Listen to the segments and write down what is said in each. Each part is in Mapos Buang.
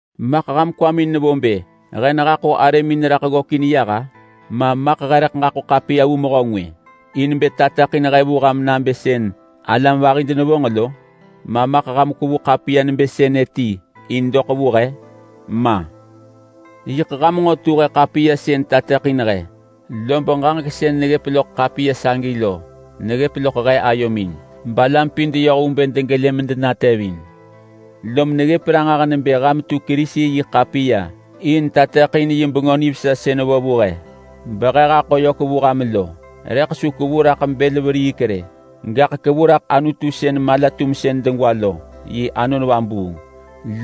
Maḳ ham kwamin nevo bë he nehaḳo arëmin raḳ ggökin yah-a? Ma maḳ he rëḳ ġaḳo ḳapiya vu mehö ngwë in bë tateḳin he vu ham nabë sën alam vahi denevonġ lo? Ma maḳ ham kwevu ḳapiya nebë sënë ti in doḳ vu he? Ma! Yiḳ ham nġo tu he ḳapiya sën tateḳin he. Lob ġaġek sën neggëp loḳ ḳapiya sagi lo neggëp loḳ he ayomin, balam pin deyoh vu bë degelë medenatevin. Lom neggëp ranġah nebë ham tu Kerisi yi ḳapiya in tateḳin yi Bengö Nivesa sën vo vu he behe haḳo yök vu ham lo. Rëḳ su kevu raḳ bël veriik rë, gaḳ kevu raḳ Anutu sën malatumsën degwa lo yi Anon Vabuung.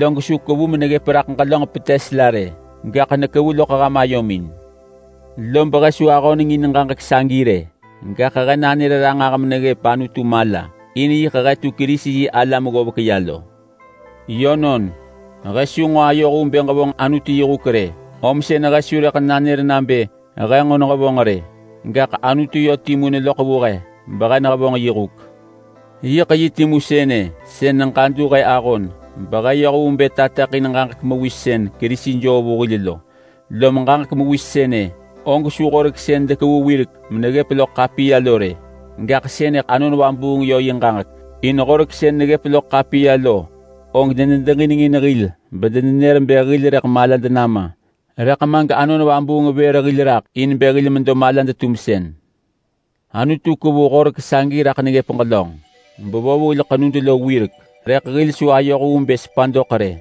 Log su kevu meneggëp raḳ ġelönġ petes la rë, gaḳ nekevu loḳ ham ayomin. Lob he su ahöneng in ġaġek sagi rë, gaḳ he nanër ranġah meneggëp Anutu mala, in sën he tu Kerisi-yi-alam ggovek ya lo. Yönon, he su nġo ayoh vu bë ġevonġ Anutu yi huk rë, om sën he su rëḳ nanër nabë he nġo nehevonġ rë, gaḳ Anutu yö timu neloḳ vu he behe nehevonġ yi huk. Yiḳ yi timu sënë sën neġadu he ahon behe yoh vu bë tateḳin ġaġek mewis sën Kerisi joo vu hil lo. Lom ġaġek mewis sënë og su Horek sën dekevu wirek meneggëp loḳ ḳapiya lo rë, gaḳ sënëḳ Anon Vabuung yö yi ġaġek. In Horek sën neggëp loḳ ḳapiya lo og denedeġinengin hil bedenenër bë hil rëḳ malad nama. Rëḳ ma gAnon Vabuung vër hil raḳ in bë hil medo malad-tumsën. Anutu kevu Horek sagi raḳ neggëp ġelönġ bevo vu hil ḳenud lo wirek, rëḳ hil su ayoh vu bë sepa doḳ rë,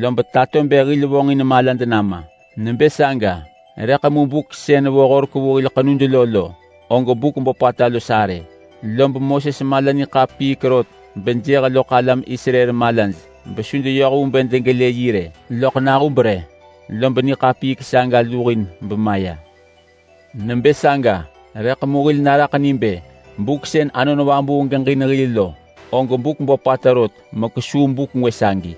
lob tato bë hil vonġin malad nama. Nebë saga rëḳ mu buk sën vo Horek vu hil ḳenud lo lo, og buk böpata los arë, lob Moses mala niḳapiik ata bejëh loḳ alam Israel malaj besu deyoh vu bë degelë yi rë. Loḳ nahub rë lob niḳapiik saga nemaya. Nebë saga rëḳ mu hil naraḳ ni bë buk sën Anon Vabuung geġin hil lo, og buk böpata rot mekesuu buk ngwë sagi.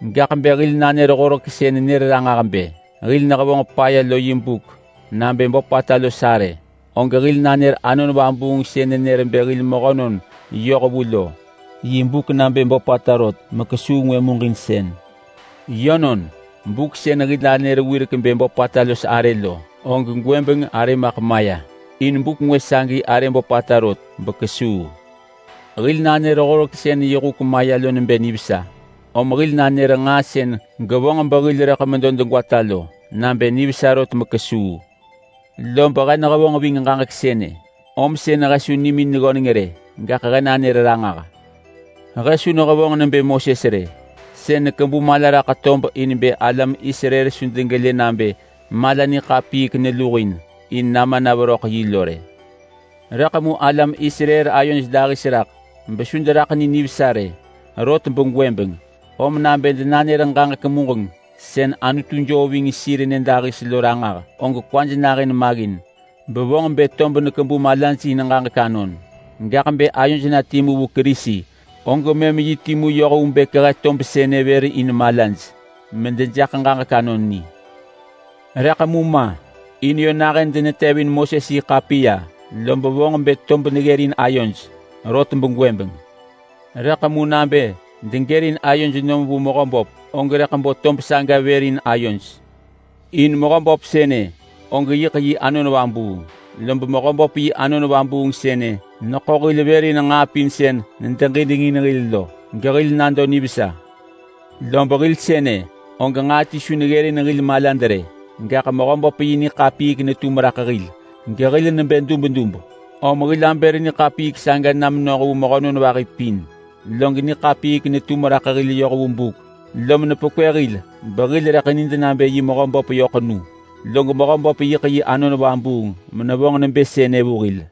Gaḳ bë hil nanër Horek sën nenër ranġah bë hil nehevonġ paya lo yi buk nabë böpata los arë, og hil nanër Anon Vabuung sën nenër bë hil mehönon yohvu lo yi buk nabë böpata rot mekesuu ngwë muġinsën. Yönon, buk sën hil anër wirek bë böpata los arë lo, og gwëbeng arë maḳ maya, in buk ngwë sagi arë böpata rot bekesuu. Hil nanër Horek sën yi huk maya lo nebë nivesa, om hil nanër nġaa sën gevonġ behil rëḳ medo degwata lo nabë nivesa rot mekesuu. Lob he nehevonġ ving ġaġek sënë, om sën he su nimin ggöneng rë, gaḳ he nanër ranġah. He su nehevonġ nebë Moses rë. Sën nekebu mala raḳ tob in bë alam Israel su degelë nabë mala niḳapiik nemaya in nama na veröḳ yi lo rë. Rëḳ mu alam Israel ayoj dahis raḳ besu deraḳ ni nivesa rë, rot begwëbeng. Om nabë denanër ġaġek muġeng sën Anutu joo ving sir nyëdahis lo ranġah, og kwaj nahën maggin bevonġ bë tob nekebu malaj in ġaġek anon. Gaḳ bë ayoj na timu vu Kerisi og mëm yi timu yoh vu bë kehe tob sënë vër in malaj medejaḳ ġaġek anon ni. Rëḳ mu ma, in yö nahën denetevin Moses yi ḳapiya, lob vonġ bë tob neggërin ayoj. Rot begwëbeng. Rëḳ mu nabë degërin ayoj nom vu Mehöböp og rëḳ bo tob saga vër in sir. In Mehöböp sënë og yiḳ yi Anon Vabuung, lob Mehöböp yi Anon Vabuung sënë neḳo hil vër in nġaa pin sën nedeġinengin hil lo gehil nado nivesa. Lob hil sënë, og nġaa ti su neggërin hil malad rë, gaḳ Mehöböp yi niḳapiik netum raḳ hil gehil nebë dubdub, om hil abër niḳapiik saga na menoh vu mehönon vahi pin. Log niḳapiik netum raḳ hil yoh vu buk, lom nepekwë hil behil rëḳ nid nabë yi Mehöböp yö ḳenu. Log Mehöböp yiḳ yi Anon Vabuung menevonġ nebë sënë vu hil.